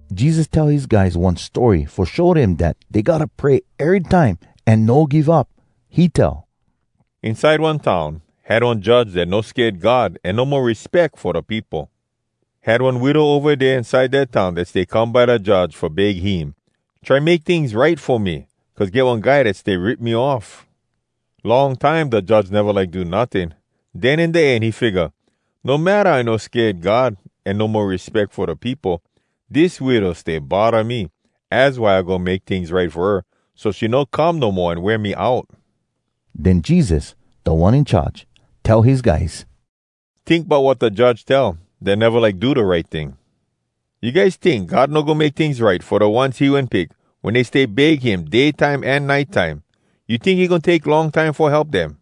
Jesus tell his guys one story fo show dem dat dey gotta pray erytime an no give up. He tell, “Inside one town, had one judge dat no sked God an no mo respeck fo da peopo. Had one widow ova dea inside dat town dat stay come by da judge fo beg him, ‘Try make tings right fo me! Cuz get one guy dat stay rip me off.’ Long time da judge neva like do notting. Den in da end he figga, ‘No matta I no sked God an I no mo respeck fo da peopo, dis widow stay bodda me, az why I goin make tings right fo her, so she no come no mo an wear me out!’” Den Jesus, Da One In Charge, tell his guys, “Tink bout wat da judge tell, dat neva like do da right ting. You guys tink God no goin make tings right fo da ones he wen pick, wen dey stay beg him day time an nite time? You tink he goin take long time fo help dem?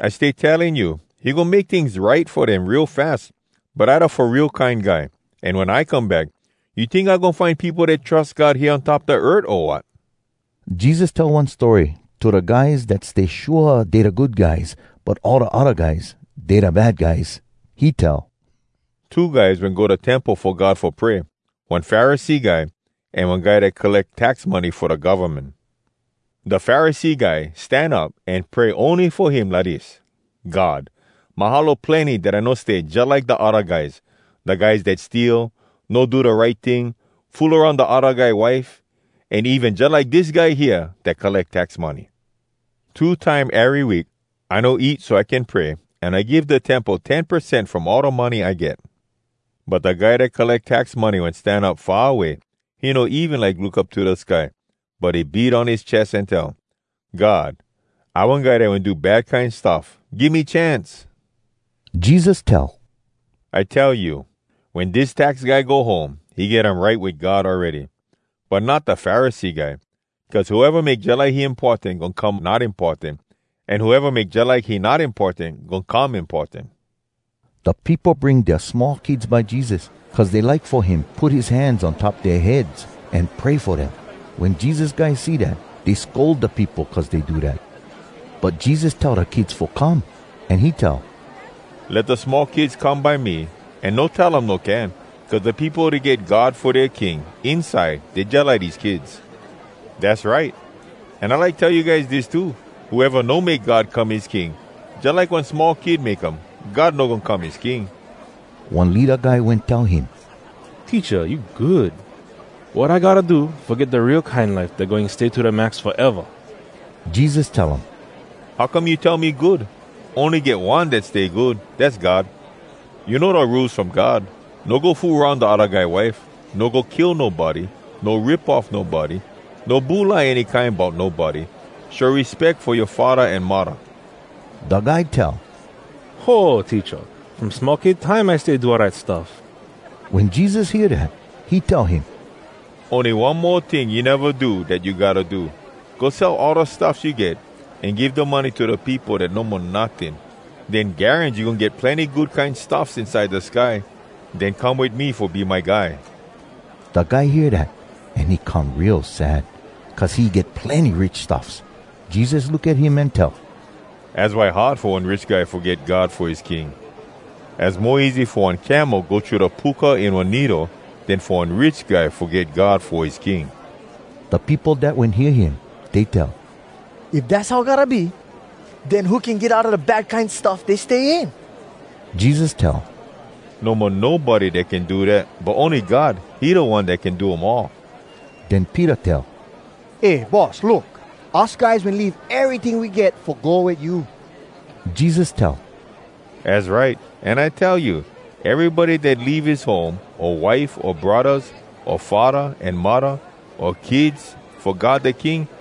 I stay telling you, he goin make tings right fo dem real fas. But I da Fo Real Kine Guy, an wen I come back, you tink I goin find peopo dat trus God hea on top da earth, o wat?” Jesus tell one story to da guys dat stay shua dey da good guys but all da odda guys, dey da bad guys. He tell, “Two guys wen go da Temple Fo God fo pray, one Pharisee guy, an one guy dat colleck tax money fo da govmen. Da Pharisee guy stan up an pray ony fo him lidis, ‘God, mahalo plenny dat I no stay jalike da odda guys, da guys dat steal, no do da right ting, fool aroun da odda guy wife, an even jalike dis guy hea dat colleck tax money. Two time ery week, I no eat so I can pray, an I give da Temple ten percent from all da money I get.’ But da guy dat colleck tax money wen stan up far away. He no even like look up to da sky, but he beat on his ches an tell, ‘God, I one guy dat wen do bad kine stuff. Give me chance!’” Jesus tell, “I tell you, wen dis tax guy go home, he get um right wit God awready. But not da Pharisee guy. Cuz whoeva make jalike he importan goin come not importan, an whoeva make jalike he not importan goin come importan.” Da peopo bring dea small kids by Jesus, cuz dey like fo him put his hands on top dea heads an pray fo dem. Wen Jesus guys see dat, dey scold da peopo cuz dey do dat. But Jesus tell da kids fo come, an he tell, “Let da small kids come by me, an no tell um no can, cuz da peopo dat get God fo dea king, inside dey jalike dese kids. Dass right! An I like tell you guys dis too: Whoeva no make God come his king jalike one small kid make um, God no goin come his king.” One leada guy wen tell him, “Teacha, you good. Wat I gotta do fo get da real kine life dat goin stay to da max foeva?” Jesus tell um, “How come you tell me good? Ony get One dat stay good, dass God. You know da Rules From God: ‘No go fool aroun da odda guy wife, no go kill nobody, no rip off nobody, no bulai any kine bout nobody, show respeck fo yoa faddah an muddah.’” Da guy tell, “Ho, Teacha! From small kid time I stay do all dat stuff.” Wen Jesus hear dat, he tell him, “Ony one mo ting you neva do dat you gotta do. Go sell all da stuffs you get, an give da money to da peopo dat no mo notting. Den garans you goin get plenny good kine stuffs inside da sky. Den come wit me fo be my guy.” Da guy hear dat, an he come real sad, cuz he get plenny rich stuffs. Jesus look at him an tell, “Az why hard fo one rich guy fo get God fo his king! Az mo easy fo one camel go thru da puka in one needle, den fo one rich guy fo get God fo his king.” Da peopo dat wen hear him, dey tell, “If dass how gotta be, den who can get outa da bad kine stuff dey stay in?” Jesus tell, “No mo nobody dat can do dat, but ony God, he da One dat can do um all.” Den Peter tell, “Eh Boss, look! Us guys wen leave eryting we get fo go wit you.” Jesus tell, “Az right! An I tell you, erybody dat leave his home o wife o braddahs o faddah an muddah o kids fo God da King,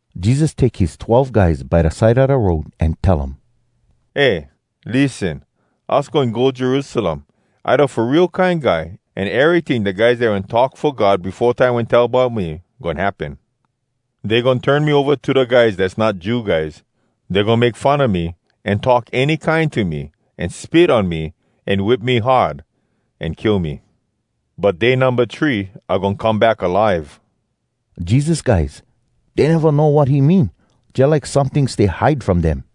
Jesus take his twelve guys by da side a da road, an tell um, “Eh, lissen, us goin go Jerusalem. I da Fo Real Kine Guy, an eryting da guys dat wen talk fo God befo time wen tell bout me, goin happen. Dey goin turn me ova to da guys dass not Jew guys. Dey goin make fun a me, an talk any kine to me, an spit on me, an whip me hard, an kill me. But day numba three, I goin come back alive.” Jesus guys, dey neva know wat he mean. Jalike someting stay hide from dem.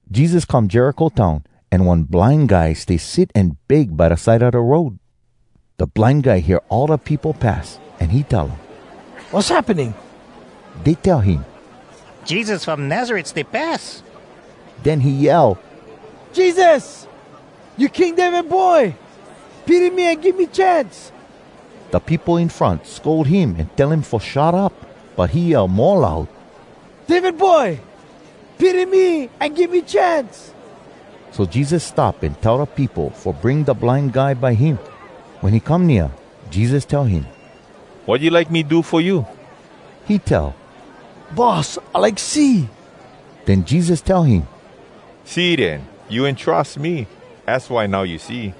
Jesus come Jericho town, an one blind guy stay sit an beg by da side a da road. Da blind guy hear all da peopo pass, an he tell um, “Wass happening?” Dey tell him, “Jesus from Nazaret stay pass.” Den he yell, “Jesus! You King David boy! Pity me an give me chance!” Da peopo in front scold him an tell him fo shut up. But he yell mo loud, “David boy! Pity me an give me chance!” So Jesus stop an tell da peopo fo bring da blind guy by him. Wen he come nea, Jesus tell him, “Wat you like me do fo you?” He tell, “Boss, I like see.” Den Jesus tell him, “See den! You wen trus me. Az why now you see.”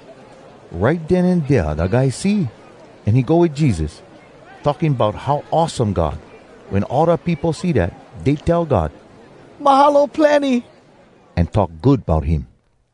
Right den an dea da guy see, an he go wit Jesus, talking bout how awesome God. Wen all da peopo see dat, dey tell God “Mahalo plenny!” an talk good bout him.